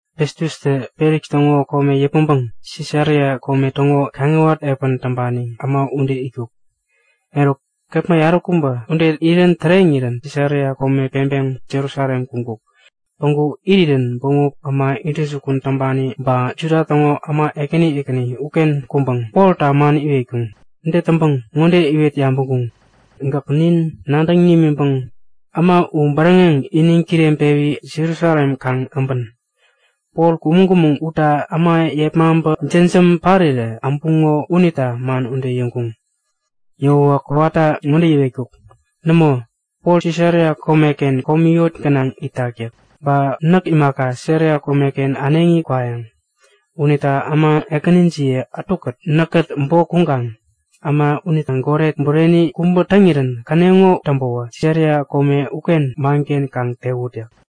Festustä Feliks täŋo kome yäpmäŋpäŋ Sisaria kome täŋo kaŋiwat epän täŋpani äma ude itkuk. Eruk kepma yaräkubä ude irän täreŋirä Sisaria kome peŋpeŋ Jerusalem kuŋkuk. Päŋku irirän bämop äma intäjukun täŋpani ba Juda täŋo äma ekäni ekäni uken kuŋpäŋ Polta man iwetkuŋ. Ude täŋpäŋ ŋode iwet yabäŋkuŋ; Gäk nin nadäŋ nimiŋpäŋ äma u bäräŋeŋ iniŋ kireŋpewi Jerusalem kaŋ äbän. Pol kumäŋ-kumäŋ utta äma yepmaŋpä jämjäm parirä äbuŋo unita man ude yäŋkuŋ. Yäwäwä kowata ŋode yäwetkuk; Nämo! Pol Sisaria komeken komi yot gänaŋ itak yäk. Ba näk imaka, Sisaria komeken äneŋi kwayäŋ. Unita äma ekänijiye ätukät näkkät bok kuŋkaŋ äma unitä goret bureni kubä täŋirän käneŋo täŋpäwä Sisaria kome uken manken kaŋ tewut yäk.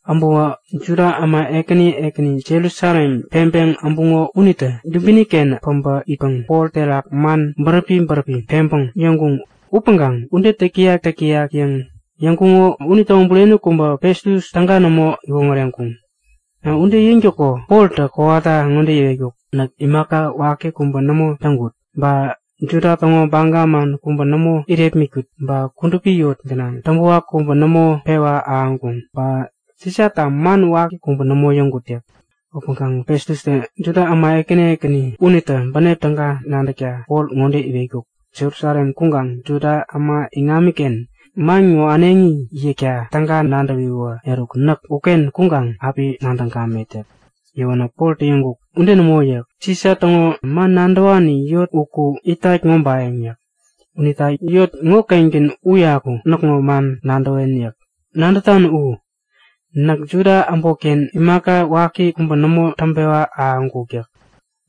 Äbäwä Juda äma ekäni ekäni Jerusalem peŋpeŋ äbuŋo unitä dubini-ken päbä itpäŋ Pol terak man bäräpi bäräpi peŋpäŋ yäŋkuŋ. Upäŋkaŋ ude täk-täyak täk-täyak yäŋ yäŋkuŋo unitäŋo bureni kubä Festus täga nämo iwoŋäreŋkuŋ. Ude yäŋtäko Poltä kowata ŋode yäwetkuk; Näk imaka waki kubä nämo täŋkut yäk. Ba Juda täŋo baga man kubä nämo irepmitkut, ba kudupi yot gänaŋ täŋpäwak kubä nämo pewa ahäŋkuŋ. Ba Sisata man waki kubä nämo yäŋkut yäk. Upäŋkaŋ Festustä Juda äma ekäni ekäni unitä bänep täga nadäkta Pol ŋode iwetkuk; Jerusalem kuŋkaŋ Juda äma iŋamiken man ŋo äneŋi yäkta täga nadäwiwä, eruk näk uken kuŋkaŋ api nadäŋ gamet yäk. Yäwänä Poltä yäŋkuk; Ude nämo yäk. Sisa täŋo man nadäwani yot uku itat ŋobayäŋ yäk. Unita yot ŋokengän uyaku näkŋo man nadäwen yäk. Nadätan u, näk Juda äbotken imaka waki kubä nämo pewa ahäŋkuk yäk.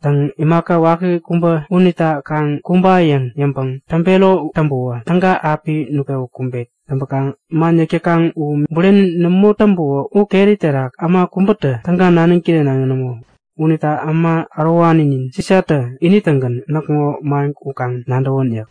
Täŋ, imaka waki kubä unita kaŋ kumba yäŋ yäŋpäŋ täŋpero täŋpäwä, täga api nutpewä kumbet. Täŋpäkaŋ man yäk täkaŋ u bureni nämo täŋpäwä u keri terak äma kubätä täga naniŋ kirenaŋi nämo. Unita äma ärowaninin Sisatä ini-tägän näkŋo man u kaŋ nadäwän yäk.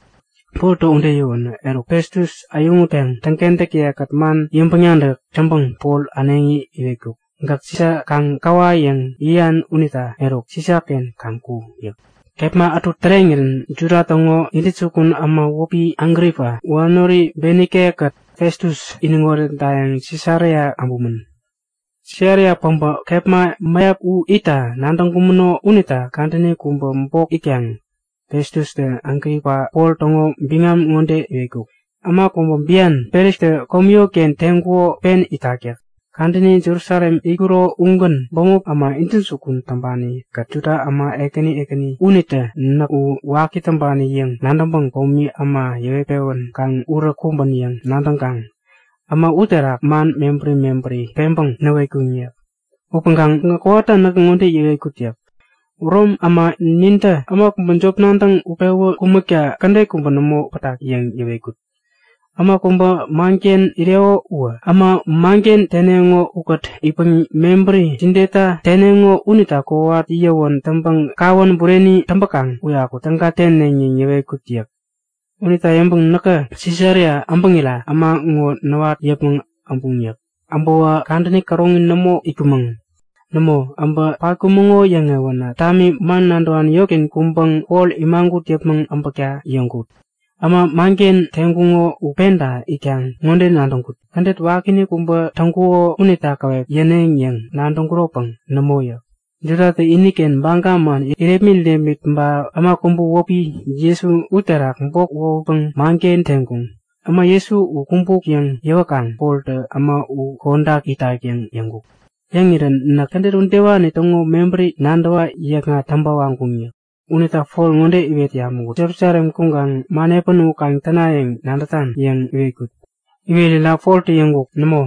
Poltä ude yäwänä, eruk Festus äyäŋutpäŋ täŋkentäkiye-kät man yäŋpäŋ-nadäk täŋpäŋ Pol äneŋi iwetkuk; Gäk Sisa kaŋ käwa yäŋ yäyan unita eruk, Sisaken kaŋ ku! yäk. Kepma ätu täreŋirän Juda täŋo intäjukun äma wäpi Agripa, wanori Benike-kät Festus iniŋ oretdayäŋ Sisaria äbumän. Sisaria päbä kepma mäyap u itta nadäŋkumäno unita kadäni kubä bok itkaŋ Festustä Agripa Pol täŋo biŋam ŋode iwetkuk; Äma kubä bian Felikstä komi yotken teŋkuko pen itak yäk. Kadäni Jerusalem itkuro ugän bämop äma intäjukun täŋpani-kät Juda äma ekäni ekäni unitä näkä U waki täŋpani yäŋ nadäŋpäŋ komi äma yäwet-pewän kaŋ urä kumbän yäŋ nadäŋkaŋ äma uterak man mebäri mebäri peŋpäŋ näwetkuŋ yäk. Upäŋkaŋ näkä kowata ŋode yäwetkut yäk. Rom äma nintä äma kubä jop nadäŋ utpewä kumäkta kädet kubä nämo pätak yäŋ yäwetkut. Äma kubä manken ireko uwä äma manken teneŋo ukät itpäŋ mebäri jideta teneŋo unita kowat yäwän täŋpäŋ kawän bureni täŋpäkaŋ uyaku täga täne yäŋ yäwetkut yäk. Unita yäŋpäŋ näkä Sisaria äbäŋira äma ŋo näwat yäpmäŋ äbuŋ yäk. Äbäwä kadäni käroŋi nämo itkumäŋ. Nämo, äbä patkumäŋo yäŋewänä tami man nadäwani yotken kuŋpäŋ Pol imagut yäpmäŋ äbäkta yäŋkut. Äma manken teŋkuŋo u penta itkaŋ ŋode nadäŋkut; Kädet wakiinik kubä täŋkuko unita käwep yäneŋ yäŋ nadäŋkuropäŋ nämo yäk. Judatä iniken baga man irepmit-irepmit ba äma kubä wäpi Jesu uterak bok wohutpäŋ manken teŋkuŋ. Äma Jesu u kumbuk yäŋ yäwäkaŋ Poltä äma u kodak itak yäŋ yäŋkuk. Yäŋirä näk kädet udewani täŋo mebäri nadäwa yäkŋat täŋpa waŋkuŋ yäk. Unita Pol ŋode iwet yabäŋkut; Jerusalem kuŋkaŋ man epän u kaŋ täna yäŋ nadätan? yäŋ iwetkut. Iwerira Poltä yäŋkuk; Nämo,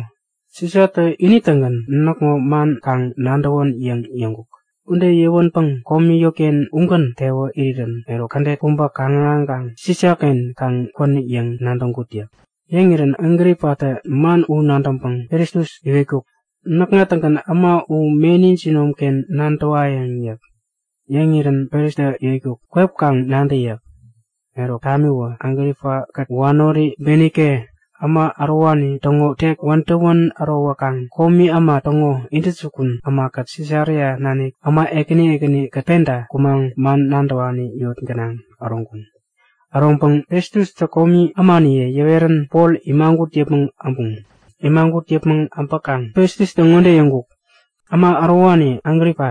Sisatä ini-tägän näkŋo man kaŋ nadäwän yäŋ yäŋkuk. Ude yäwänpäŋ komi yotken ugän tewa irirän, eruk kädet kubä kaŋ-ahäŋkaŋ Sisaken kaŋ kwän yäŋ nadäŋkut yäk. Yäŋirän Agripatä man u nadäŋpäŋ Festus iwetkuk; Näkŋa-tägän äma u meni jinomken nadäwayäŋ yäk. Yäŋirän Festustä iwetkuk; Kwep kaŋ nadä yäk. Eruk, tamiwä Agripa-kät wanori Benike äma ärowani täŋo tek wädäwän ärowäkaŋ komi äma täŋo intäjukun ämakät Sisaria nanik äma ekäni ekäni-kät penta kumaŋ man nadäwani yot gänaŋ äroŋkuŋ. Äroŋpäŋ Festustä komi ämaniye yäwerän Pol imagut yäpmäŋ äbuŋ. Imagut yäpmäŋ abäkaŋ Festustä ŋode yäŋkuk; Äma ärowani Agripa,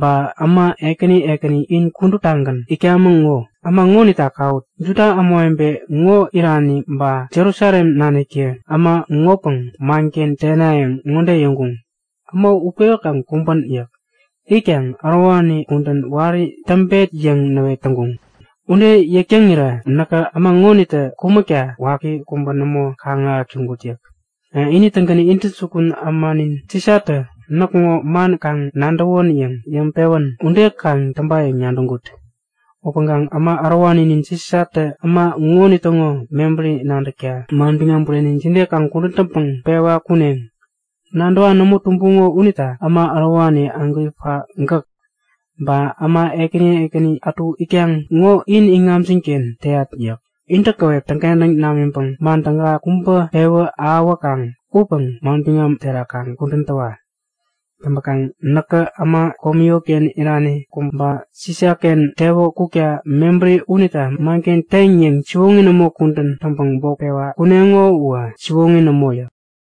ba äma ekäni ekäni in kuduptagän itkamäŋ ŋo, äma ŋonita kawut! Juda ämawebe ŋo irani, ba Jerusalem naniktä äma ŋopäŋ manken tenayäŋ ŋode yäŋkuŋ; Äma u utpewi kaŋ kumbän! yäk. Itkaŋ ärowani kudän wari täŋpek yäŋ näwet täŋkuŋ. Ude yäk täŋirä näkä äma ŋonitä kumäkta waki kubä nämo kaŋ-ahäk täŋkut yäk. Ini-tägän intäjukun ämanin Sisatä näkŋo man kaŋ nadäwän yäŋ yäŋpewän ude kaŋ täŋpayäŋ nadäŋkut. Upäŋkaŋ Äma ärowaninin Sisatä äma ŋonitäŋo mebäri nadäkta manbiŋam bureni jide kaŋ kudän täŋpäŋ pewa kuneŋ? Nadäwa nämo tumbuŋo unita äma ärowani Agripa gäk, ba äma ekäni ekäni ätu itkaŋ ŋo in iŋamjin-ken teyat yäk. Intä käwep täŋkentäŋ namiŋpäŋ man täga kubä pewä ahäwäkaŋ upäŋ manbiŋam terak kaŋ kudän täwa! Täŋpäkaŋ näkä äma komi yotken irani kubä Sisaken tewä kukta mebäri unita manken teŋ yäŋ siwoŋi nämo kudän täŋpäŋ bok pewa kuneŋo uwä siwoŋi nämo yäk.